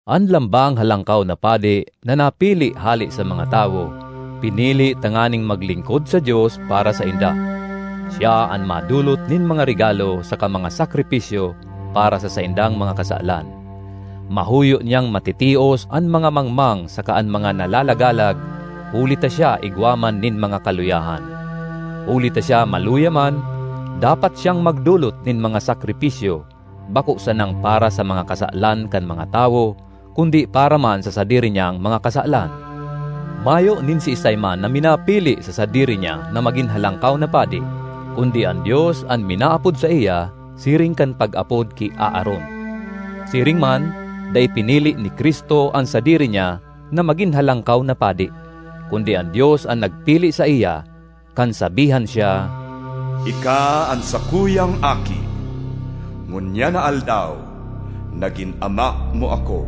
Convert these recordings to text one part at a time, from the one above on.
An lambang halangkaw na padi, na napili hale sa mga tawo, pinili tanganing maglingkod sa Dios para sainda. Siya an madolot nin mga regalo saka mga sakripisyo para sa saindang mga kasalan. Mahuyo niyang matitios an mga mangmang saka an mga nalalagalag huli ta siya igwa man nin mga kaluyahan. Huli ta siya maluya man, dapat siyang magdolot nin mga sakripisyo, bako sanang para sa mga kasalan kan mga tawo kundi para man sa sadiri niyang mga kasalan. Mayo nin siisay man na minapili sa sadiri niya na magin halangkaw na padi, kundi an Dios an minaapod saiya siring kan pag-apod ki Aaron. Siring man dai pinili ni Cristo an sadiri niya na magin halangkaw na padi, kundi an Dios an nagpili saiya, kan sabihan siya, “Ika an sakuyang Aki, ngunyan na aldaw nagin Ama mo ako.”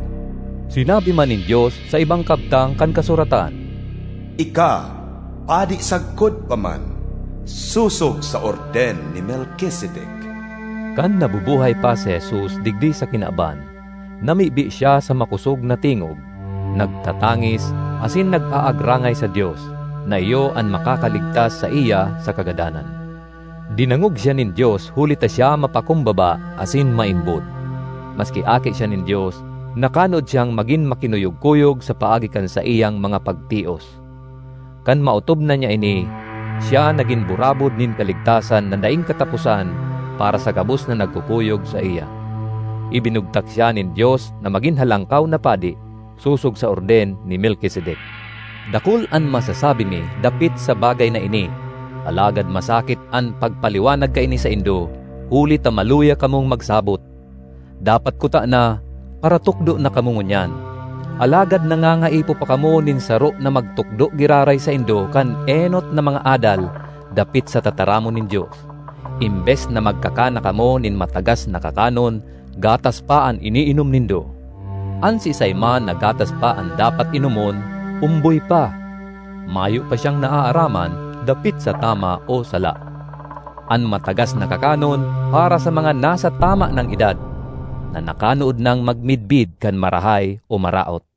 Sinabi man nin Dios sa ibang kabtang kan kasuratan, “Ika padi sagkod pa man, sosog sa orden ni Melkisedek.” Kan nabubuhay pa si Jesus digdi sa kinaban, namibi siya sa makosog na tingog, nagtatangis asin nag-aagrangay sa Dios, na iyo an makakaligtas saiya sa kagadanan. Dinangog siya nin Dios huli ta siya mapakumbaba sin (asin) maimbod. Maski Aki siya nin Dios nakanood siyang magin makinuyog-kuyog sa paagi kan saiyang mga pagtios. Kan maotob na niya ini, siya nagin burabod nin kaligtasan na daing kataposan para sa gabos na nagkukuyog saiya. Ibinugtak siya nin Dios na magin halangkaw na padi, sosog sa orden ni Melkisedek. Dakul an masasabi mi dapit sa bagay na ini, alagad masakit an pagpaliwanag kaini saindo, huli ta maluya kamong magsabot. Dapat kutana, paratukdo na kamo ngunyan, alagad nangangaipo pa kamo nin saro na magtukdo giraray saindo kan enot na mga adal dapit sa tataramon nin Dios. Embes na magkakan na kamo nin matagas na kakanon, gatas pa an iniinom nindo. An siisay man na gatas pa an dapat inomon, omboy pa; mayo pa siyang naaaraman dapit sa tama o sala. An matagas na kakanon para sa mga nasa tama nang edad, na nakanood nang magmidbid kan marahay o maraot.